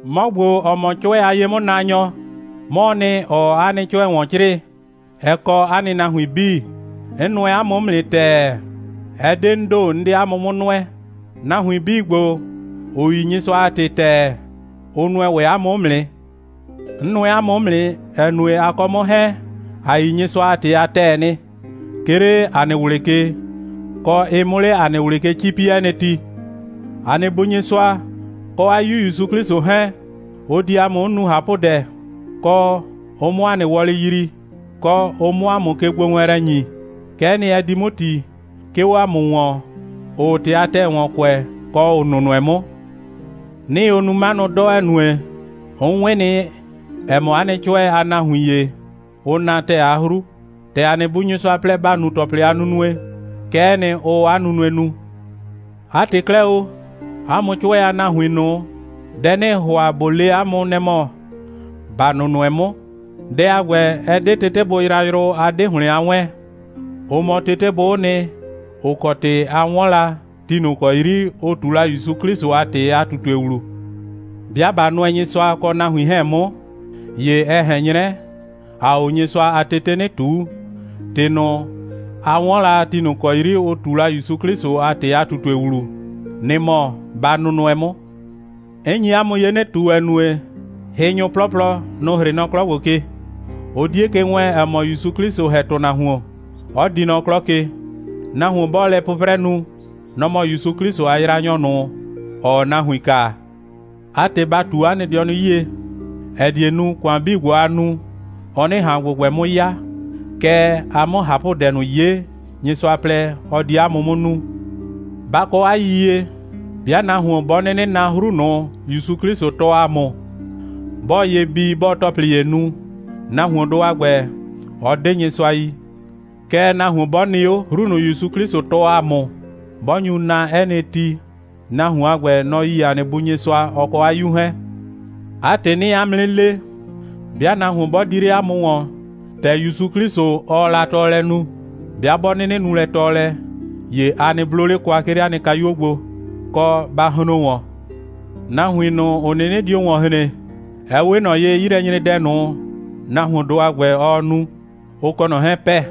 'Mɔ ‑gbo, ‑ɔ mɔ 'cʋɛ a ye'mʋnaanyɔ, 'mɔɔ nɩ, ‑ɔɔ 'a nɩ 'cʋɛ ‑wɔn 'crɩɩ, ɛ kɔ 'a nahuin 'bii. 'N nʋɛ 'a mʋ 'mʋ nɩ ‑tɛɛ. Ɛ 'de 'n ‑do, 'n 'de 'a mʋ 'mʋ nʋɛ. Nahuin 'bii ‑gbo, ‑ʋ yi Nyɩsʋa a ‑tɩ a ‑tɛɛ, ʋ nʋɛ ‑wɛ 'a mʋ 'mʋ nɩ. 'N nʋɛ 'a mʋ 'mʋ nɩ, ‑ɛ nue, a kɔ 'mʋ 'hɛɛn, ‑a yi Nyɩsʋa a ‑tɩ a ‑tɛɛ nɩ, 'ke 'le ‑a nɩ ꞊wlɩ ke, kɔ, ɩ 'mʋ 'le ‑a nɩ ꞊wlɩ ke 'cipi 'ɛ nɩ ti. ‑A nɩ Bu Nyɩsʋa kɔ 'a 'Yu ‑Yusu 'Klɩsʋ 'hɛɛn, ʋ di ‑a mʋ 'mʋ nu ꞊hapʋdɛ, kɔ, ʋ 'mʋ ‑a nɩ wɔlɩ yrii, kɔ, ʋ 'mʋ ‑a mʋ kegbowɛɛnlɛ ‑nyi. Kɛ'ɛ nɩ, ɛ di 'mʋ ‑ti, 'ke 'o ‑a mʋ ‑wɔn, ‑ʋʋ ‑tɩ a ‑tɛɛ ‑wɔn kʋɛ, kɔ ‑ʋ nʋnʋɛ 'mʋ. 'Nɩɩ o nu 'manʋ 'dɔ, ‑ɛ nue, 'n 'wɩn nɩ, ‑ɛ mɔ, 'a nɩ 'cʋɛ a nahuin ‑ye, ʋʋ na ‑tɛɛ a 'hru. ‑Tɛ ‑a nɩ Bu Nyɩsʋa plɛ, ‑ba nu ‑tɔplɩ a nunue, kɛ'ɛ nɩ, ʋʋ 'a nunue nu. 'A ‑tɩ 'klɛɛ o, 'a mʋ 'cʋɛ a nahuin ꞊nʋ, dɛ 'nɩɩ ‑hʋa ꞊bo le 'a mʋ, nɛ‑ mɔ ‑ba nʋnʋɛ 'mʋ. Dɛ a ‑gbɛ, ɛ 'de tetebʋ yrayrʋ, a 'de ‑hlɩn a 'wɛɛn. Ʋ mɔ tetebʋ'ʋ nɩ, ‑ʋ kɔ ‑tɩ ‑a 'wɔn la ti ꞊nʋ ‑kɔ 'yri ʋ ꞊tu la ‑Yusu 'Klɩsʋ a ‑tɩ a ꞊tutue ‑wlu. 'Bɩa ꞊ba nʋɛ Nyɩsʋa kɔ nahuin 'hɛɛn 'mʋ, ‑ye ɛ ꞊hɛn 'nyrɛ, ‑aa 'o Nyɩsʋa a tetei 'nɩ ꞊tuu. ‑Tɩ ꞊nʋ, a 'wɔn la ti ꞊nʋ ‑kɔ 'yri ʋ ꞊tu la ‑Yusu 'Klɩsʋ a ‑tɩ a ꞊tutue ‑wlu, nɩ‑ mɔ, ba nʋnʋɛ 'mʋ. 'N nyi 'a mʋ ye 'nɩ ꞊tu, ‑ɛ nue, hɩnyʋ 'plɔplɔ, nʋ‑ 'hrɩ nɔ 'klɔ ‑gbo ke. Ʋ 'die ke wɛɛn, ‑ɛ mɔ, ‑Yusu 'Klɩsʋ ‑hɛ ‑tʋnahuon, 'ɔ di nɔ 'klɔ ke. Nahuon 'bɔɔ lɛ 'pʋprɛ nu, nɔ‑ mɔ ‑Yusu 'Klɩsʋ a yraanyɔ ꞊nʋ, ‑ɔɔ nahuin kaa. 'A ‑tɩ, ba ꞊tu 'a nɩ dɩɔnʋ 'yie, ‑ɛ die nu, ‑kʋan 'bii ‑gbo, a nu, ɔ 'nɩ ꞊han ‑gbʋgbɛ 'mʋ 'ya, kɛɛ, a 'mʋ ꞊hapʋdɛ ꞊nʋ 'ye, Nyɩsʋa plɛ, ɔ di 'a mʋ 'mʋ nu. Ba kɔ 'a yiyie, 'bɩa nahuon 'bɔ 'nɩnɩ na 'hru ꞊nʋ, ‑Yusu 'Klɩsʋ tɔɔ ‑a mʋ, 'bɔɔ ye bii, 'bɔɔ ‑tɔplɩ ‑ye nu, nahuondʋ a ‑gbɛ, ɔ 'de Nyɩsʋa yi. Kɛɛ, nahuon 'bɔ nɩ 'o, 'hru ꞊nʋ, ‑Yusu 'Klɩsʋ tɔɔ ‑a mʋ, 'bɔ nyu na 'ɛ nɩ ti, nahuon a ‑gbɛ, nɔ‑ yi ‑a nɩ Bu Nyɩsʋa, ɔ kɔ 'a 'Yu 'hɛɛn. 'A ‑tɩ, 'nɩɩ 'a mʋ 'nɩ le, 'bɩa nahuon 'bɔ di 'le 'a mʋ ‑wɔn, ‑tɛ ‑Yusu 'Klɩsʋ, ɔɔ la tɔɔlɛ nu, 'bɩa 'bɔ 'nɩnɩ nu lɛ tɔɔlɛ, ‑ye a nɩ 'blo 'le kwa, 'ke 'le 'a nɩ kayuo gbo, kɔ, ba hron ‑wɔn. Nahuin ꞊nʋ, ‑ʋ 'nɩnɩ dio ‑wɔn hren, ɛ 'we ꞊nɔ ye, 'yilɛnyredɛ ꞊nʋ, nahuondʋ a ‑gbɛ, ɔɔ nu, ʋ kɔ ꞊nɔ 'hɛɛn pɛ.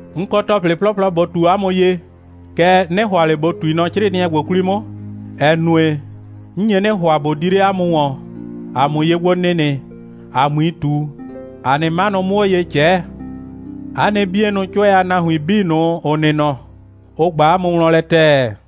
'N kɔ ‑tɔplɩ 'plɔplɔ ꞊bo ꞊tu 'a mʋ ye, kɛɛ, 'nɩ ‑hʋa ꞊le ꞊bo ꞊tui nɔ 'crɩɩnɩɛ ‑gbo 'kwli 'mʋ, ‑ɛ nue, 'n nye 'nɩ ‑hʋa, ꞊bo di 'le 'a mʋ ‑wɔn, ‑a 'mʋ ye gbo nɩnɩ, ‑a 'mui ꞊tu, ‑a nɩ 'manʋ 'mʋ 'o ye ꞊cɛɛ. 'A nɩ 'bienʋ 'cʋɛ a nahuin 'bii ꞊nʋ, ‑ʋ nɩ nɔ, ʋ ꞊gba 'a mʋ wlɔn lɛ ‑tɛɛ.